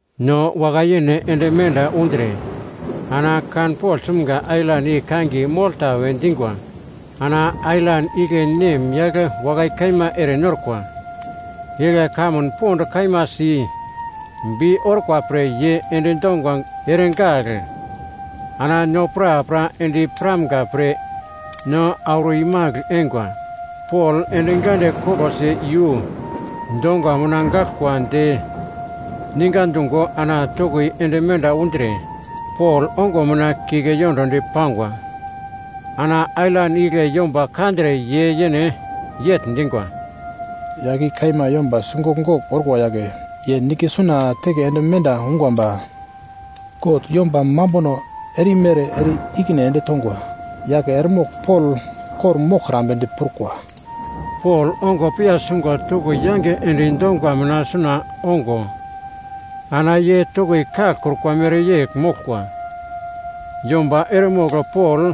No wakai-yene ende menda undre ana kanpogl sumga ailan i kangiye Molta we dingwa. Ana ailan igle nemyagl wakai kaima erenorkwa. Igle kamun pond kaima si bi orkwa pre ye endi donga eregagl ana no prapra endi piramga pre no auro imagl eingwa. Pol endi gande koglosi iyu donga mina gaglkwa de ninga dungo ana toki ende menda undre Pol ongo mina kike yondodi pangwa. Ana ailan igle yomba kandre ye yene yegl dingwa, “Yagl i kaima yomba sigogl-gogl orkwa yagle, ye nigle suna teke ende menda ungwa ba god yomba mambuno erimere ere-ikine ende tongwa yagle eremogl Pol kor-moglkrambe diprukwa.” Pol ongo piya sungo toki yange endi donga mina suna ongo ana ye toki kaglkrukwa mereyegl moglkwa. Yomba eremogl Pol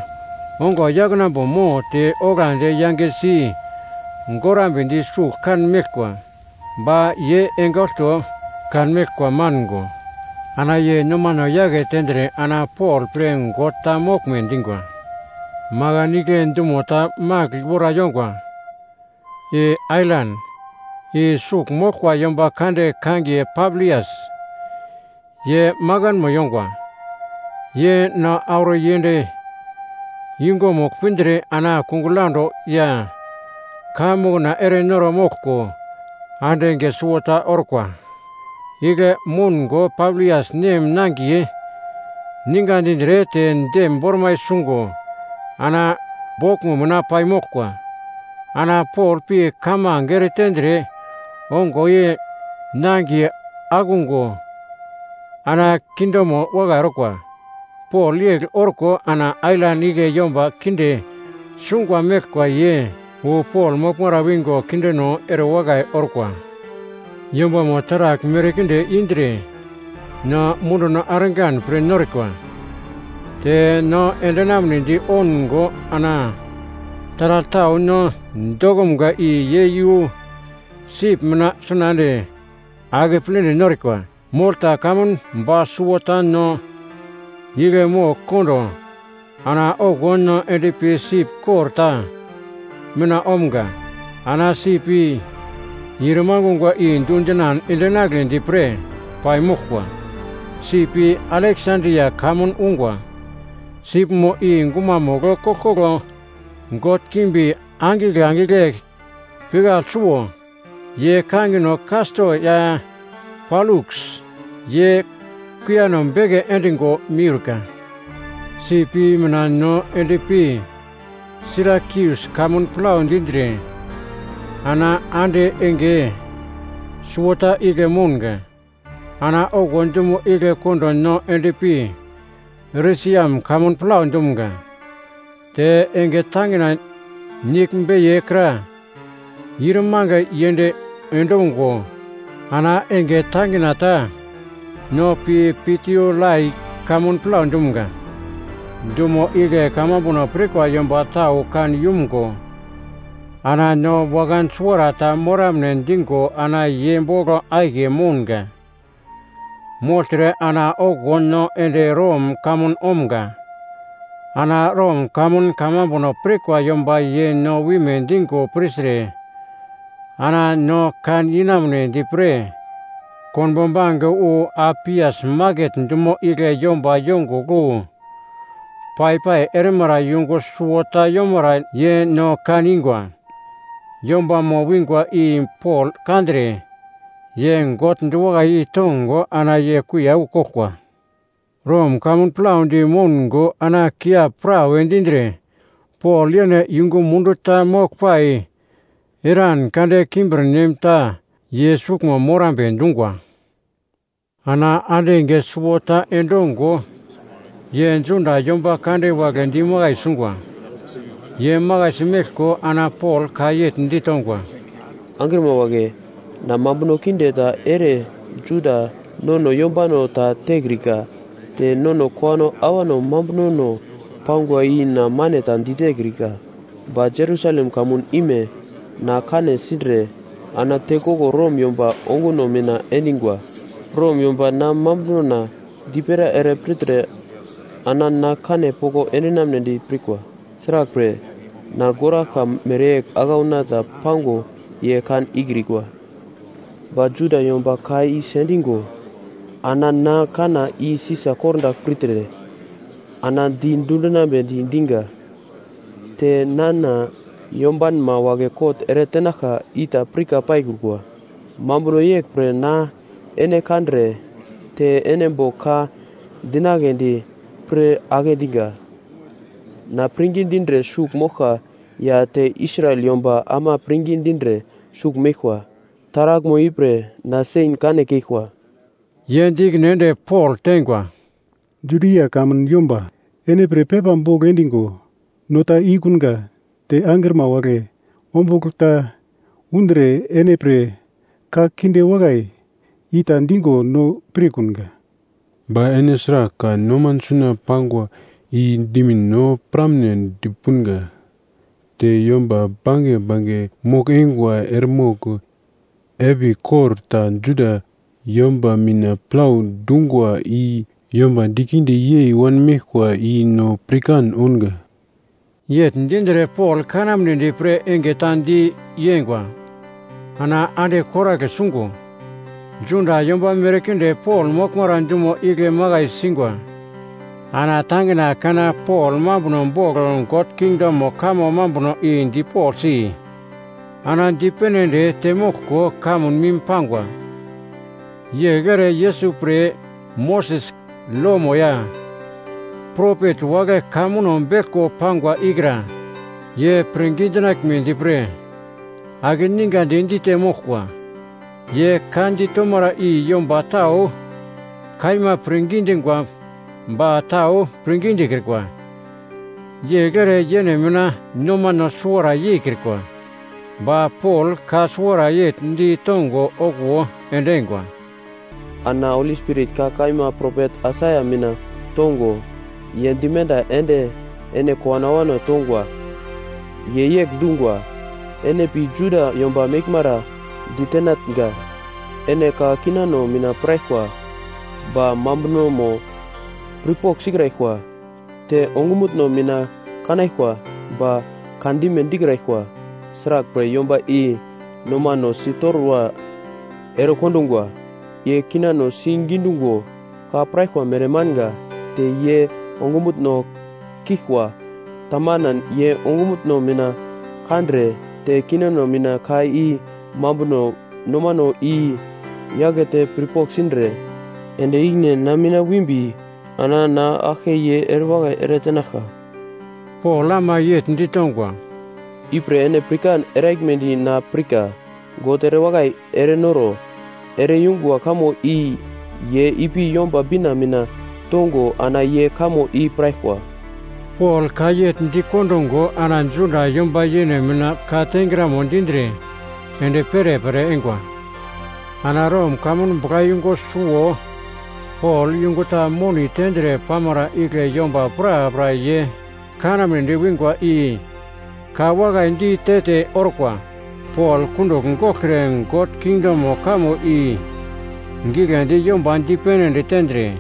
ongo yaknambo mo te oglandi yangesi gorambedi sugl kan meglkwa. Ba ye enge olto kanmeglkwa mango ana ye nomano yake tendre ana Pol pre god ta moglme dingwa. Makan igle dumo ta magl wora yongwa i ailan, i sugl moglkwa yomba kande kangiye Pablias, ye makanmo yongwa. Ye no auro yend yungumugl pindre ana kungugl yaundo ya kaiya mokna erenoro moglko ande enge suwota orkwa. Igle moungo Pablias nem nangiye ninga dindre te dem bormai sungo ana boglmo mina paimoglkwa. Ana Pol pi kamange eretendre ongo ye nangiye akungo ana kindemo wakai orkwa. Pol yegl orko ana ailan igle yomba kinde sungo meglkwa ye wu Pol moglmara wingo kindeno erewakai orkwa. Yombamo taragl merkinde indre no munduno argan pre norikwa. Te no endinamnedi oungo ana taragl tau no dokumga i ye iyu sip mina suna ende akepledi norikwa. Molta kamun ba suwota no igle mogl kondo ana okuwo no endpi sip kor ta mina omga. Ana sip i ir mangungwa i dundinan endinagledi pre paimoglkwa. Sip i Aleksandria kamun ungwa. Sipmo i gumamugl koglkoglo god kimbi angigle angigle pikagl suwo, ye kangino Kasto ya Poluks, ye kuiyano beke endingo miurka. Sip i mina no endpi Sirakius kamun plau dindre ana ande enge suwota igle mounga. Ana okuwo dumo igle kondo no endpi Resiam kamun plau dumga. Te enge tangina nigl beiye kra ir mange yend endungo ana enge tangina ta no pi Piutiolai kamun plau dumga. Dumo igle kamambuno pirkwa yomba tau kan yumgo ana no wakan suwarata moramne dingo ana ye bogl akiye mounga. Mogltre ana okuwo no ende Rom kamun omga. Ana Rom kamun kamambuno pirkwa yomba ye no wime dingo pirtre ana no kan inamunedi pre konbo bange wu Apias maket dumo igle yomba yongugl wu pai-pai erimara yungu suwota yomara ye no kan ingwa. Yombamo wingwa i Pol kandre ye God diwakai yei tongo ana ye kuiya wu koglkwa. Rom kamun plaudi moungo ana kiap prawe dindre Pol yene yungu mundu ta moglpai eran kade kimbirnem ta ye suglmo morambe dungwa. Ana ande enge suwota endongo ye Juda yomba kande wagle dimakai sungwa. Ye makaisi meglko ana Pol ka yegl ditongwa, “Angrima wagle, na mambuno kinde ta ere Juda nono yombano ta tekrika te nono kowano awano mambunono pangwa i na mane ta ditekrika. Ba Jerusalem kamun ime na kane sindre ana tekoglo Rom yomba onguno mina endingwa. Rom yomba na mambunona dipera ere pirtre ana na kane poko endinamnedi pirkwa, sraglpre, na goraglka mereyegl aglauna ta pango ye kan ikrikwa. Ba Juda yomba ka i sendingo ana na kanna i Sisa kordagl pirtre ana di dundinambe dinga. Te nana yombanma wagle kot ere tenaglka i ta pirka paikrukwa. Mambuno yeglpre na ene kandre te ene bogl ka dinagledi pre agle dinga. Na pirngi dindre sugl moglka ya te Israel yomba ama pirngi dindre sugl meglkwa, taraglmo ipre na sen kane keglkwa.” Ye di ikine ende Pol tengwa, “Judia kamun yomba ene pre pepa bogl endingo no ta ikunga te angrima wagle ombugl ta undre ene pre ka kinde wakai i ta dingo no pirkunga. Ba ene sragl ka noman suna pangwa i dimin no piramnedi punga, te yomba bange bange mogl-eingwa eremogl epigl kor ta Juda yomba mina plau dungwa i yomba dikinde yei wanmeglkwa i no pirkan ounga.” Yegl dindre Pol kanamnedi pre enge ta di yengwa. Ana ande koragle sungo, Juda yomba merkinde Pol moglmara dumo igle makai singwa. Ana tangina kana Pol mambuno bogl God kingdomo kamo mambuno i dipoglsi ana dipene ende temoglko kamun mim pangwa. Yegl ere Yesus pre Moses lomo ya propet wagle ka muno beglko pangwa ikra; ye pirngi dinaglmedi pre akeningandi dite moglkwa. Ye ka ditomara i yomba tau kaima pirngi dingwa ba tau pirngi dikrikwa. Yegl ere yene mina nomano suwara yeikrikwa, ba Pol ka suwara yegl ditongo okuwo endingwa, “Ana Holi Spirit ka kaima propet Aisaia mina tongo, ye dimenda ende ene kowano awano tongwa. Ye yegl dungwa: “‘Ene pi Juda yomba meglmara ditenatnga, “Ene ka kinano mina piraglkwa ba mambunomo pirpogl sikraglkwa, te ongumutno mina kanaglkwa ba kandime dikraglkwa. Sraglpre, yomba i nomano sitorwa erekondungwa, ye kinano si gidungo ka piraglkwa mere manga, te ye ongumutno kiglkwa. Tamanan, ye ongumutno mina kandre, te kinano mina ka i mambuno nomano i-yakete pirpogl sindre, ende ikine na mina wimbi, ana na aglke ye erewakai ere tenaglka!’” Pol ama yegl ditongwa, “Ipre ene pirkan eraglmedi na pirka, God erewakai erenoro ere-yungwa kamo i ye ipi Yomba Bina mina tongo ana ye kamo i piraglkwa.” Pol ka yegl dikondungo ana Juda yomba yene mina ka tengramo dindre ende perepere eingwa. Ana Rom kamun buglayungu suwo Pol yungu ta moni tendre pamara igle yomba prapra ye kanamnedi wingwa i ka wakai di te-te orkwa. Pol kundugl goglkre God kingdomo kamo i giglendi yomba dipene ende tendre,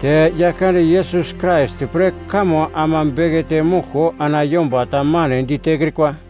te Yaglkande Yesus Krais pre kamo ama bekete moglko ana yomba ta mane ditekrikwa.